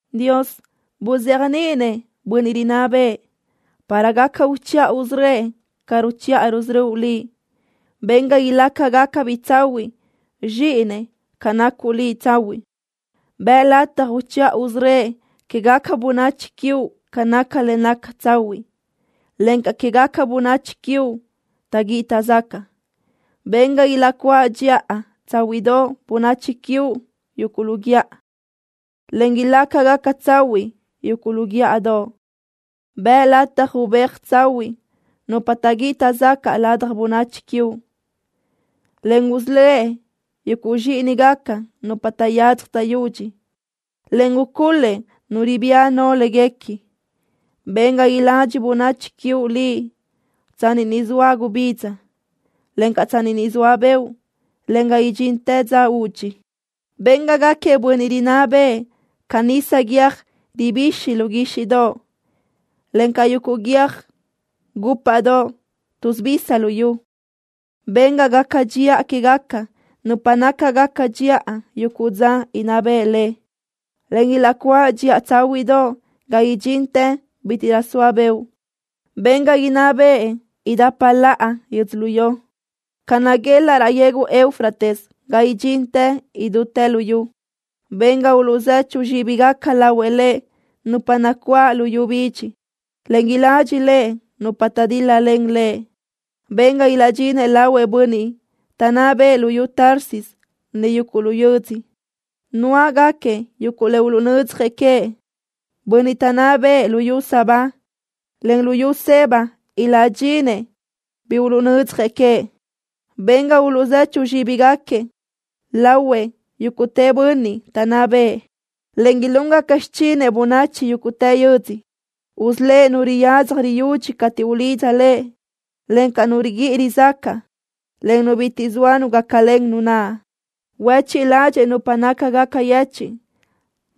Dios, buzéajniʼinëʼ bönniʼ rinná bëʼë para gaca uchiʼa usörö́ëʼ ca ruchiʼa rusörö́uʼ Liʼ. Ben ga ilácagacabiʼ tsahuiʼ zxíʼinëʼ ca nacuʼ Liʼ tsahuiʼ. Bëʼë lataj uchiʼa usörö́ëʼ quégaca bönachi quiuʼ ca naca le naca tsahuiʼ, encaʼ quégaca bönachi quiuʼ taʼguíʼi taʼzacaʼ. Ben ga ilaʼcuáʼ dxiʼa tsáhuiʼdoʼ bönachi quiuʼ yuguʼ lu guíʼa, en ilácagaca tsahuiʼ yuguʼ lu guíʼadoʼ. Bëʼë lataj ubéajëʼ tsahuiʼ nupa taʼguíʼi taʼzacaʼ ladaj bönachi quiuʼ, en usölë́ʼ yuguʼ zxíʼinigaca nupa taʼyadzaj taʼyudxi, en ucul-lëʼ nu ribía no léguequi. Ben ga iladxi bönachi quiuʼ Liʼ tsanni niʼ soa gubidza, encaʼ tsanni niʼ soa beoʼ ga idxintë dza udxi. Ben ga gáquiëʼ bönniʼ rinná bëʼë ca nisa guiö́j ribixi lu guíxiʼdoʼ, en ca yuguʼ guiö́j gúpaʼdoʼ tuʼsubisa luyú. Ben ga gaca dxiʼa quégaca nupa nácagaca dxiʼa yuguʼ dza inná bëʼë lëʼ, en ilaʼcuáʼ dxiʼa tsáhuiʼdoʼ ga idxintë bítiʼrö soa beoʼ. Ben ga inná bëʼë idapa laʼa yödzölió, ga naguelaʼ raʼ yegu Eufrates ga idxintë idútë luyú. Ben ga uluʼzechu zxíbigaca lahuëʼ lëʼ nupa nacuáʼ luyú bidxi, en iladxi lëʼ nupa taʼdíl-lalen lëʼ. Ben ga ilaʼdxinëʼ lahuëʼ bönniʼ taʼnná bëʼë luyú Tarsis en yuguʼ lu yödzö, nuáʼgaquiëʼ yuguʼ le uluʼnödzjëʼ queëʼ. Bönniʼ taʼnná bëʼë luyú Sabá, en luyú Seba iláʼdxinëʼ bi uluʼnödzjëʼ queëʼ. Ben ga uluʼzechu zxíbigaquiëʼ lahuëʼ yúguʼtë bönniʼ taʼnná bëʼë, en ilúngaca xichinëʼ bönachi yúguʼtë yödzö. Usölë́ʼ nu riyadzaj riyudxi cateʼ ulidza lëʼ, encaʼ nu riguíʼi rizacaʼ, en nu bitiʼ zoa nu gácalen nu naʼ. Huéchiʼ ládxëʼë nupa nácagaca yechiʼ,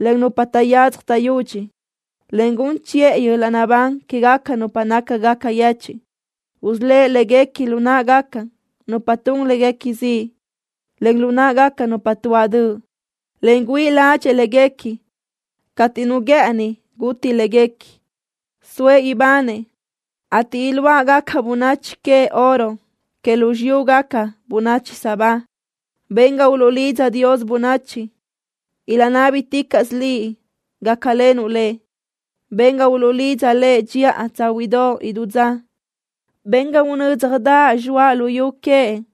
en nupa taʼyadzaj taʼyudxi, en gun chiʼë yöl-laʼ naʼbán quégaca nupa nácagaca yechiʼ. Usölë́ʼ léguequi lu náʼagaca nupa tun léguequi ziʼ, en lu náʼagaca nupa tuáʼ döʼ, en güíʼi ládxëʼë léguequi cateʼ nu guë́ʼëni guti léguequi. Soëʼ ibanëʼ, ateʼ iluáʼgaca bönachi queëʼ oro que lu xiyúgaca bönachi Sabá. Ben ga uluʼlidza Dios bönachi, ilaʼnábiticaʼsö Liʼ gácalenuʼ lëʼ. Ben ga uluʼlidza lëʼ dxiʼa tsáhuiʼdoʼ idú dza. Ben ga unö́dzjadaʼ zxoaʼ luyú queëʼ,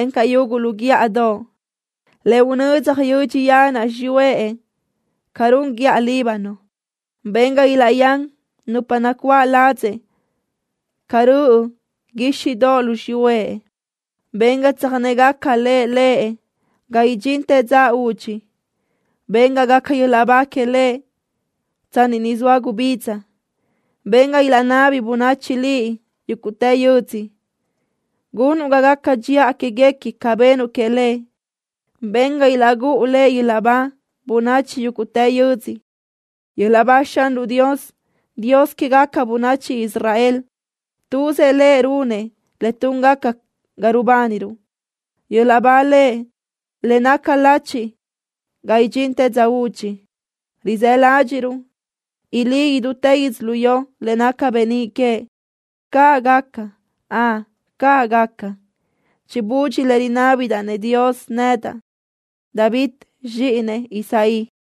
encaʼ yuguʼ lu guíʼadoʼ, le unödzaj yödxi yanaʼ xiyúëʼ ca run guíʼa Líbano. Ben ga ilaʼyán nupa nacuáʼ ladzëʼ ca röʼö guíxiʼdoʼ lu xiyúëʼ. Ben ga tsöjnégaca le lëʼ ga idxintë dza udxi. Ben ga gaca yöl-laʼ ba que lëʼ tsanni niʼ soa gubidza. Ben ga ilaʼnabi bönachi Liʼ yúguʼtë yödzö gunuʼ ga gaca dxiʼa quéguequi ca benuʼ queëʼ lëʼ. Ben ga ilaʼgúʼu lëʼ yöl-laʼ ba bönachi yúguʼtë yödzö. ¡Yöl-laʼ ba Xanruʼ Dios, Dios quégaca bönachi Israel! ¡Tuzëʼ Lëʼ runëʼ le túngaca ga rubániruʼ! ¡Yöl-laʼ ba Lëʼ le naca lachi ga idxintë dza udxi! ¡Rizë́ ládxiʼruʼ ilí idútë yödzölió le naca beníʼ queëʼ! ¡Caʼ gaca! ¡Ön, caʼ gaca! Chibudxi le rinábidaʼ-nëʼ Dios nedaʼ, David, zxíʼinëʼ Isaí.